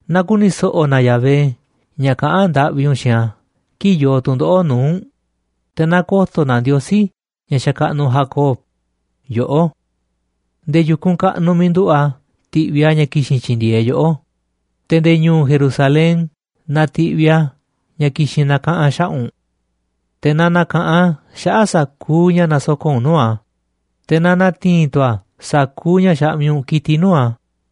Na ku̱ni̱ so̱ꞌo̱ na Yahvé ña̱ kaꞌán ndaꞌvi u̱nꞌ xiinꞌ a̱ kii̱ꞌ yoo tu̱ndoꞌo̱ꞌ nuu̱ꞌ u̱nꞌ, te̱ na ko̱to̱ na Ndiosí, ña̱ xakaꞌnuꞌ Jacob, yoꞌó. Nde̱e̱ yu̱kunꞌ kaꞌnuꞌ miiꞌ nduꞌu̱ꞌ a̱ ti̱ꞌviꞌ a̱ ña̱ ki̱xi̱n tyi̱ndi̱e̱eꞌ yoꞌó, te̱ nde̱e̱ ñu̱u̱ Jerusalén na ti̱ꞌviꞌ a̱ ña̱ ki̱xi̱n na̱kaꞌa̱n xaꞌa̱ꞌ u̱nꞌ. Te̱ na na̱ka̱ꞌanꞌ a̱ xaꞌa̱ꞌ sa̱kuuꞌ ña̱ nasoko̱ꞌ u̱nꞌ nuu̱ꞌ a̱, te̱ na na̱ti̱i̱n tu̱ a̱ sa̱kuuꞌ ña̱ xaꞌmiꞌ u̱nꞌ ki̱tiꞌ nuu̱ꞌ a̱.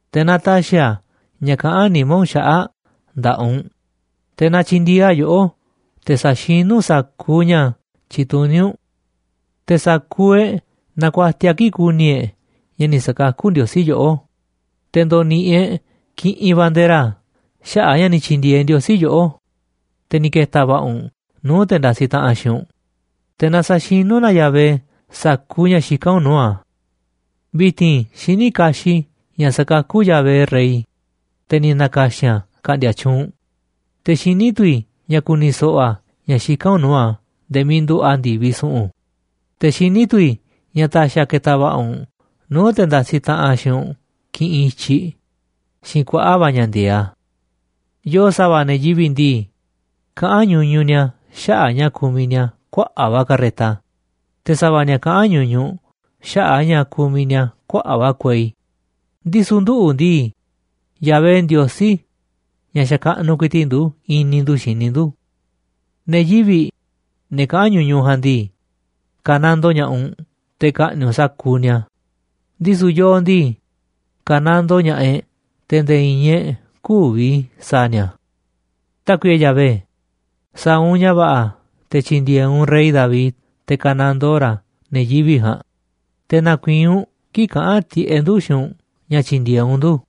Te̱ na ta̱xi̱ a̱ ña̱ kaꞌán nimá u̱nꞌ xaꞌa̱ꞌ nda̱ꞌaꞌ u̱nꞌ, te̱ na tyi̱ndi̱e̱eꞌ a̱ yoꞌó te̱ sa̱xinú u̱nꞌ sa̱kuuꞌ ña̱ tyituní u̱nꞌ. Te̱ sa̱kuuꞌ e̱ꞌ na̱ku̱a̱tiaꞌ kii̱ꞌ ku̱ni̱ e̱ꞌ ña̱ ni̱ sa̱kakú Ndiosí yoꞌó, te̱ ndo̱ni̱ꞌi̱ e̱ꞌ kiꞌinꞌ bandera xaꞌa̱ꞌ a̱ ña̱ ni̱ tyi̱ndi̱e̱eꞌ Ndiosí yoꞌó, te̱ ni̱ ke̱ta̱ va̱ꞌa̱ u̱nꞌ nuu̱ꞌ te̱ ndasiꞌ taꞌanꞌ xiinꞌ u̱nꞌ, te̱ na sa̱xinú na Yahvé sa̱kuuꞌ ña̱ xikán u̱nꞌ nuu̱ꞌ a̱. Vi̱ti̱n xiní kaxiꞌ i̱ ña̱ sakakú Yahvé rey, te̱ ni̱ na̱ka̱xi̱n a̱ ka̱ꞌndi̱a̱ tyuunꞌ, te̱ xiní tu̱ i̱ ña̱ ku̱ni̱ so̱ꞌo̱ a̱ ña̱ xikán u̱nꞌ nuu̱ꞌ a̱ nde̱e̱ miiꞌ nduꞌu̱ꞌ a̱ ndi̱viꞌ su̱ꞌu̱n, te̱ xiní tu̱ i̱ ña̱ ta̱xi̱ a̱ ke̱ta̱ va̱ꞌa̱ u̱nꞌ nuu̱ꞌ te̱ ndasiꞌ taꞌanꞌ xiinꞌ u̱nꞌ kiꞌinꞌ i̱tyiꞌ xiinꞌ kuaꞌa̱ꞌ va̱ ña̱ ndi̱e̱eꞌ a̱. Yoo sa̱va̱ ne̱ yivi̱ꞌ ndii, kaꞌán ñuñuꞌ ni̱a̱ xaꞌa̱ꞌ a̱ ña̱ kumiꞌ ni̱a̱ kuaꞌa̱ꞌ va̱ carreta, te̱ sa̱va̱ ni̱a̱ kaꞌán ñuñuꞌ xaꞌa̱ꞌ a̱ ña̱ kumiꞌ ni̱a̱ kuaꞌa̱ꞌ va̱ kuei, ndisu̱ nduꞌu̱ ndii, Yahvé, Ndiosí ña̱ xakaꞌnuꞌ ku̱i̱ti̱ꞌ ndu̱, i̱ni̱ ndu̱ xini ndu̱. Ne̱ yivi̱ꞌ, ne̱ kaꞌán ñuñuꞌ ja̱a̱nꞌ ndii, ka̱nandoo ña̱ꞌaꞌ u̱nꞌ te̱ ka̱ꞌni̱ꞌ u̱nꞌ sa̱kuuꞌ ni̱a̱, ndisu̱ yooꞌ ndii, ka̱nandoo ña̱ꞌaꞌ e̱ꞌ te̱ nde̱e̱ i̱i̱n e̱ꞌ kü̱vi̱ sa̱a̱ ni̱a̱. Tákuiꞌe Yahvé, sa̱a̱ u̱nꞌ ña̱ va̱ꞌa̱ te̱ tyi̱ndi̱e̱eꞌ u̱nꞌ rey David te̱ ka̱nandoo ra̱ ne̱ yivi̱ꞌ ja̱a̱nꞌ, te̱ na̱ku̱i̱i̱n u̱nꞌ kii̱ꞌ kaꞌa̱n tiꞌeꞌ ndu̱ xiinꞌ u̱nꞌ ña̱ tyi̱ndi̱e̱eꞌ u̱nꞌ ndu̱.